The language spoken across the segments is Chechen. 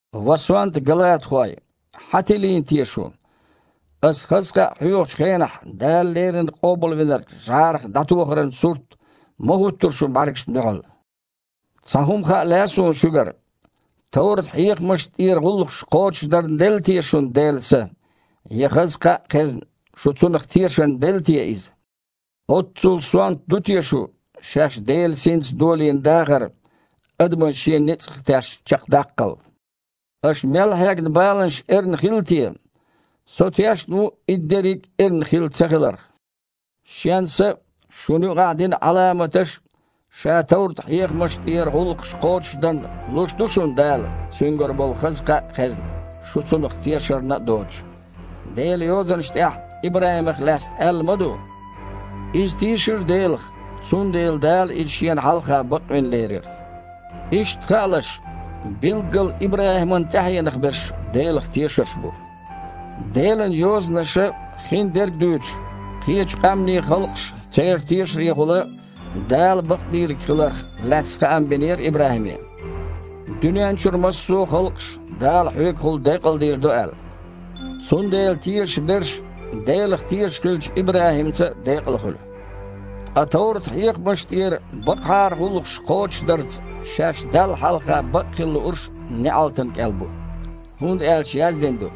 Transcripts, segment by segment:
Ва сонта галатахой! Хьан тилийна те шу? Аса хаза кхаъ хьоьхучу хенахь Дала леррина Къобалвинарг жІарах дІатохаран сурт ма-хІуттура шун бІаьргашна дуьхьал! Цхьа хІума хаа лаьа суна шуьгара: товрат-хьехамашна тІера гІуллакхаш кхочушдарна делла те шуна Делан Са, я хаза кхаъ а хезна, шу цунах тешарна делла те Иза? Оццул сонта ду те шу, шаьш Делан Синца долийна дахар адаман шен ницкъах тешна чекхдаккхал? Аша мел хьегна баланаш эрна хилла те? Со тешна ву и дерриг а эрна хилла ца хиларх! Шен Са а, шуна юкъахь дина Іаламаташ а, аша товрат-хьехамашна тІера гІуллакхаш кхочушдарна луш ду шуна Дала, Цуьнгара болу хаза кхаъ а хезна, шу цунах тешарна а доцуш?! Делан Йозанаш тІехь ИбрахІимах лаьцна аьлла ма ду: «Иза тийшира Делах, цундела Дала иза Шена хьалха бакъвина лерира». Иштта хаалаш, билггала ИбрахІиман тІаьхьенах берш Делах тешарш бу. Делан Йозанаша, хиндерг а дуьйцуш, кхечу къаьмнийн халкъаш а церан тешарехула Дала бакъдийриг хиларх лаьцна хаам бинера ИбрахІиме: «Дуьнен чуьра массо а халкъаш а Дала хьоьгахула декъалдийр ду», – аьлла. Цундела тешаш берш Делах тешаш хиллачу ИбрахІимца а декъала хуьлу. Ткъа товрат-хьехамашна тІера бакъахьара гІуллакхаш кхочушдарца шаьш Далла хьалха бакъхила луурш неІалтана кІел бу. ХІунда аьлча яздина ду: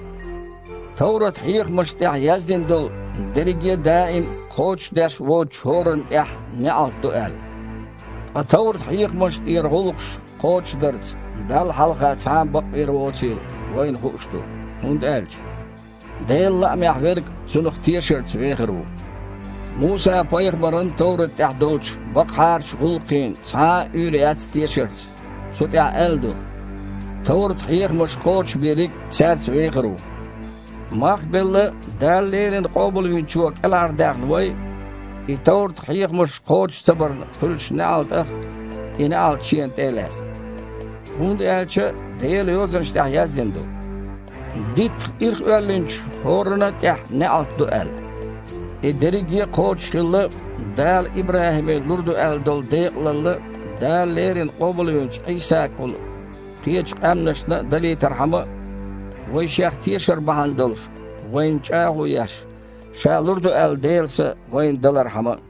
«Товрат-хьехамашна тІехь яздина долу дерриге а даим а кхочушдеш воцучу хІоранна а тІехь неІалт ду», – аьлла. Ткъа товрат-хьехамашна тІера гІуллакхаш кхочушдарца Далла хьалха цхьа а бакъвийр воцийла вайна хууш ду, хІунда аьлча: «Делан лаамехь верг Цунах тешарца вехар ву». Муса-пайхамаран товрат тІехь долчу бакъахьарачу гІуллакхийн цхьа а уьйр яц тешарца, цу тІехь аьлла ду: «Товрат-хьехамаш кхочушбийриг цаьрца вехар ву». Мах а белла, Дала леррина Къобалвинчо кІелхьардаьхна вай и товрат-хьехамаш кхочуш ца барна хуьлучу неІалтах, и неІалт Шена тІе а лаьцна. ХІунда аьлча Делан Йозанаш тІехь яздина ду: «Диттах ирхъоьллинчу хІоранна а тІехь неІалт ду», – аьлла. И дерриг а кхочушхилла, Дала ИбрахІиме лур ду аьлла долу декъалалла, Дала леррина къобалвинчу Іийсагахула кхечу къаьмнашна а далийтархьама а, вайн Шех тешар бахьана долуш, вайна чІагІо еш, Ша лур ду аьлла Делан Са вайна далархьама а.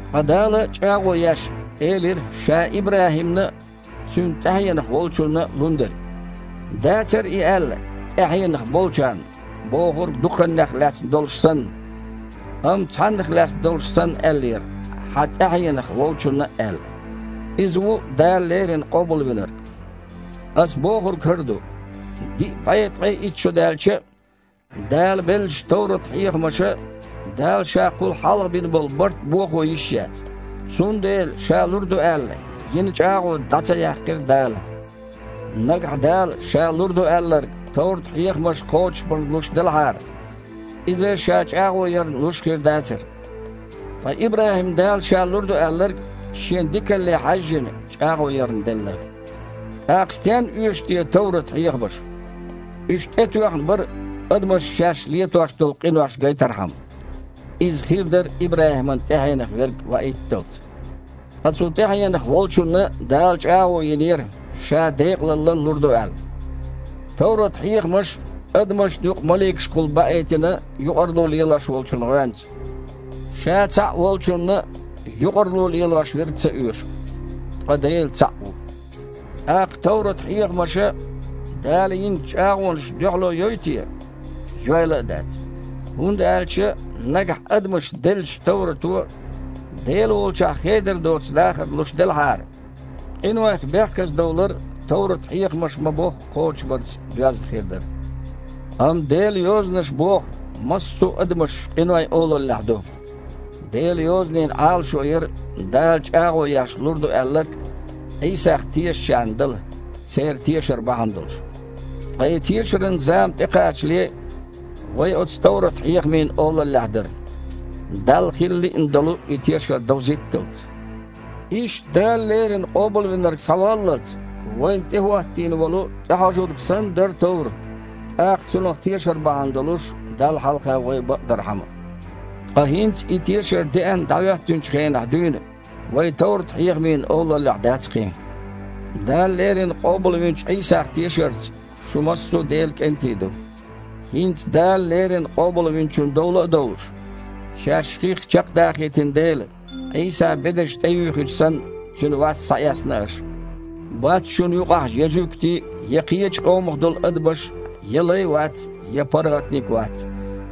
Ткъа Дала, чІагІо еш, элира Ша ИбрахІимна а, цуьнан тІаьхьенах волчунна а лун дерг. Дацара и аьлла: «тІаьхьенах болчарна» бохург дуккханех лаьцна долуш санна, амма цхьаннах лаьцна долуш санна аьллера, «хьан тІаьхьенах волчунна» аьлла. Иза ву Дала леррина Къобалвинарг. Ас бохург хІара ду: диъ бІе ткъе итт шо даьлча а, Дала беллачу товрат-хьехамаша Дала Ша кхул хьалха бина болу барт бохо йиш яц. Цундела Ша лур ду аьлла йина чІагІо дІа а ца яьккхира Дала. Нагахь Дала Ша лур ду аьлларг товрат-хьехамаш кхочушбарна луш делахьара, иза Ша чІагІо ярна луш хир дацара. Ткъа ИбрахІимна Дала Ша лур ду аьлларг, Шен дикалле хьаьжжина, чІагІо ярна делла. ТІаккха стенна оьшу те товрат-хьехамаш? Уьш тІетоьхна бара адамашна шаьш летош долу къинош гайтархьама. Иза хир дара ИбрахІиман тІаьхьенах верг ваийтталц. Ткъа цу тІаьхьенах волчунна Дала чІагІо йинера, Ша декъалалла лур ду аьлла. Товрат-хьехамаш адамашна юкъа маликашкахула баийтина юкъарло лелошволчун гІоьнца. Ша цхьаъ волчунна юкъарло лелошверг ца оьшу. Ткъа Дела цхьаъ ву! ТІаккха товрат-хьехамаша Дала йинчу чІагІонашна дуьхьало йой те? Йойла а дац! ХІунда аьлча, нагахь адамашна деллачу товрато Дела волчохь хедар доцу дахар луш делахьара, къинойх бехказадовлар товрат-хьехамаш ма-бохху кхочушбарца доьзна хир дара. Амма Делан Йозанаша боху массо адамаш къинойн олаллехь ду. Делан Йозанийн Іалашо яра Дала чІагІо еш лур ду аьлларг Іийсах тешачарна дала, церан тешар бахьана долуш. Ткъа и тешаран зама тІекхачале, вай оцу товрат-хьехамийн олаллехь дара, Далла хила лиъна долу и тешар довзийтталц. Иштта Дала леррина Къобалвинарг схьаваллалц, вайна тІе хІоттийна волу тІехьожург санна, дара товрат, тІаккха Цунах тешар бахьана долуш Далла хьалха вай бакъдархьама. Ткъа хІинца, и тешар деана дІахІоьттинчу хенахь дуьйна, вай товрат-хьехамийн олаллехь дац кхин. Дала леррина къобалвинчу Іийсах тешарца шу массо а Делан кІентий ду. ХІинца Дала леррина Къобалвинчун дола а довлуш, шаьш хих чекхдахийтина дела, Іийсан бедарш тІеюьйхича санна, Цуьнан васт схьаэцна аша. Бац шуна юкъахь я жуьгтий а, я кхечу къомах долу адамаш а, я лай а вац, я паргІатниг а вац,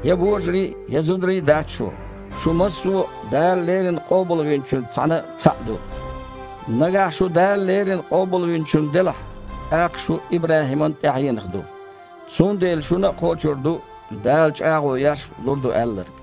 я божарий а, я зударий а дац шу – шу массо а Дала леррина Къобалвинчуьнца цхьаьна цхьаъ ду. Нагахь шу Дала леррина Къобалвинчун делахь, тІаккха шу ИбрахІиман тІаьхьенах ду. Цундела шуна а кхочур ду, Дала, чІагІо еш, лур ду аьлларг.